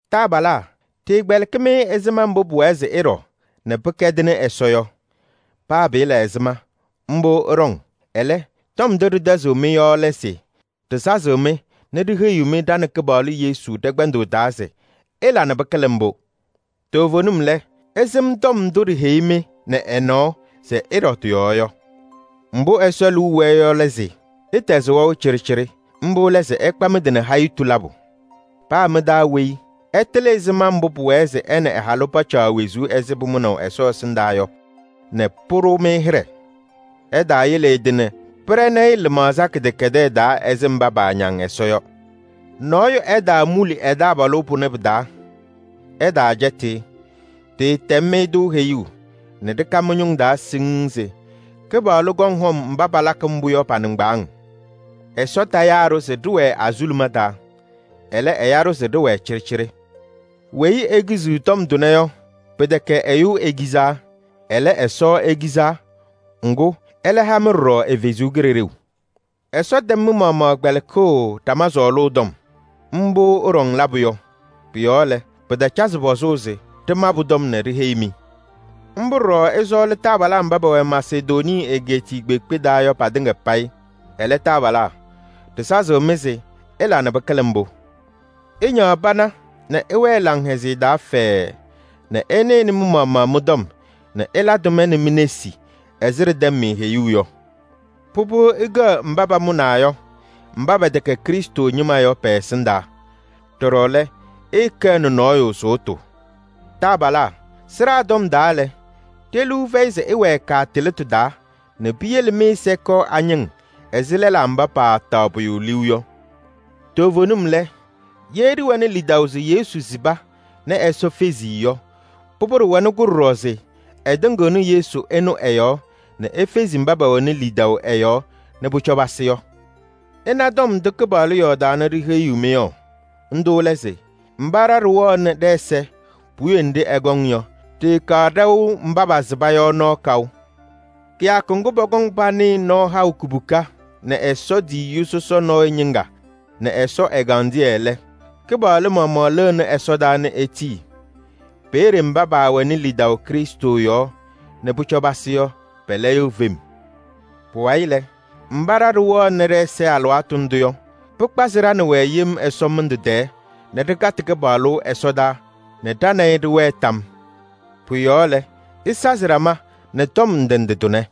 Taabalaa! Ɖɩɩkpɛlɩkɩ-mɩ ɛzɩma mbʋ pʋwɛɛ se ɩɖɔ nɛ pɩkɛdɩnɩ Ɛsɔ yɔ. Paa pɩɩla ɛzɩma, mbʋ ɩɖɔŋ. Ɛlɛ, tɔm ndʋ ɖɩtɛzɩɣnɩ-mɩ yɔ lɛ se ɖɩsazɩɣ-mɩ nɛ ɖiheyiɣ-mɩ ɖa nɛ Kɩpaɣlʋ Yesu ɖɛ-kpɛndʋʋ taa se: ɩla nɛ pɩkɩlɩ mbʋ! Toovenim lɛ, ɩsɩm tɔm ndʋ ɖiheyi-mɩ nɛ ɛ-nɔɔ se ɩɖɔ tɩ-yɔɔ yɔ. Mbʋ Ɛsɔ liu wɛɛ yɔ lɛ se: ɩtɛzɩ wɛʋ cɩɖɩcɩɖɩ. Mbʋ lɛ se ɩkpa mɩ-tɩ nɛ hayitu labʋ. Paa mɩ-taa weyi ɛtɩlɩ ɛzɩma mbʋ pʋwɛɛ se ɛ nɛ ɛ-halʋ pacaɣ wezuu ɛzɩ pʋmʋnaʋ Ɛsɔ ɛsɩndaa yɔ nɛ pʋɖʋ-mɩ hɩɖɛ. Ɛtaayele ɛ-tɩ nɛ pɩɖɛnɩ-ɩ lɩmaɣza kɩdɛkɛdɛɛ taa ɛzɩ mba paañaŋ Ɛsɔ yɔ. Nɔɔyʋ ɛtaamuli ɛ-taabalʋ pʋnɛ pɩ-taa, ɛtaacɛtɩ-ɩ. Ɖɩɩtɛm-mɩ-tʋ heyuu nɛ ɖɩka mɩ-ñʋŋ taa siŋŋ se Kɩpaɣlʋ kɔŋ hɔm mba palakɩ mbʋ yɔ pa-nɩŋgbaaŋ. Ɛsɔ tayaa-ɖʋ se ɖɩwɛɛ azuluma taa, ɛlɛ, ɛya-ɖʋ se ɖɩwɛɛ cɩɖɩcɩɖɩ. Weyi ekiziɣ tɔm tʋnɛ yɔ, pɩtɛkɛ ɛyʋ ekizaa. Ɛlɛ, Ɛsɔ ekizaa. Ŋgʋ, ɛlɛ ha-mɩ ɖɔɖɔ ɛ-Kalɩzaɣ. Ɛsɔ tɛm mɩ-maɣmaɣ kpɛlɩkʋʋ ɖama sɔɔlʋʋ tɔm. Mbʋ ɩɖɔŋ labʋ yɔ. Pʋ-yɔɔ lɛ, pɩtacazɩ pɔzʋʋ se ɖɩma pʋ-tɔm nɛ ɖiheyi-mɩ. Mbʋ ɖɔɖɔ ɩsɔɔlɩ taabalaa mba pɛwɛ Masedonii egeetiye kpeekpe taa yɔ patɩŋa payɩ. Ɛlɛ, taabalaa! Ɖɩsazɩɣ-mɩ se ɩla nɛ pɩkɩlɩ mbʋ! Ɩñaɣ pana nɛ ɩwɛɛ laŋhɛzɩyɛ taa fɛɛɛ nɛ ɩnɩnɩ mɩ-maɣmaɣ mɩ-tɔm nɛ ɩla tʋma nɛ mi-nesi ɛzɩ ɖɩtɛm-mɩ heyuu yɔ. Pʋbʋ, ɩkɛɣ mba pamʋnaa yɔ mba pɛtɛkɛ Krɩstʋ ñɩma yɔ pɛ-ɛsɩndaa. Ɖɔɖɔ lɛ, ɩɩkɛɣnɩ nɔɔyʋ sʋʋtʋ. Taabalaa! Sɩɖaa tɔm taa lɛ, ɖe-liu fɛyɩ se ɩwɛɛ kaatɩlɩtʋ taa nɛ piyele mɩ-ɛza kɔɔ añɩŋ ɛzɩ lɛlaa mba paataɣ pʋyʋ liu yɔ. Toovenim lɛ, ye ɖɩwɛnɩ lidaʋ se Yesu sɩba nɛ Ɛsɔ fezi-i yɔ, pʋbʋ, ɖɩwɛnɩ-kʋ ɖɔɖɔ se ɛtɩŋɩɣnɩ Yesu ɛnʋ ɛ-yɔɔ nɛ efezi mba pɛwɛnɩ lidaʋ ɛ-yɔɔ nɛ pʋcɔ pasɩ yɔ. Ɩna tɔm ndʋ Kɩpaɣlʋ yɔɔdaa nɛ ɖiheyiɣ-mɩ yɔ. Ndʋ lɛ se: mba ɖa ɖɩwɛɣnɩ ɖɛ-ɛza puwiye nɖɩ ɛkɔŋ yɔ, ɖɩɩkaɣ ɖɛʋ mba pasɩba yɔ nɔɔ kaʋ. Kɩyakʋ ŋgʋ, pɔkɔŋ panɩɩ nɔɔ haʋ kubuka nɛ Ɛsɔ tiyiyu sɔsɔ nɔɔyʋ ñɩŋga nɛ Ɛsɔ ɛgandɩyɛ lɛ, Kɩpaɣlʋ maɣmaɣ lɩnɩ ɛsɔdaa nɛ etii. Peeye mba paawɛnɩ lidaʋ Krɩstʋ yɔɔ nɛ pʋcɔ pasɩ yɔ, pɛlɛyɩɣ fem. Pʋwayɩ lɛ, mba ɖa ɖɩwɛɣnɩ ɖɛ-ɛza alɩwaatʋ ndʋ yɔ, pɩkpazɩ ɖa nɛ wɛ yem ɛsɔmɩndʋ tɛɛ nɛ ɖɩkatɩ Kɩpaɣlʋ ɛsɔdaa nɛ ɖa nɛ ɩ ɖɩwɛɛ tam yɔɔ. Pʋ-yɔɔ lɛ, ɩsazɩ ɖama nɛ tɔm ndɩ ndɩ tʋnɛ.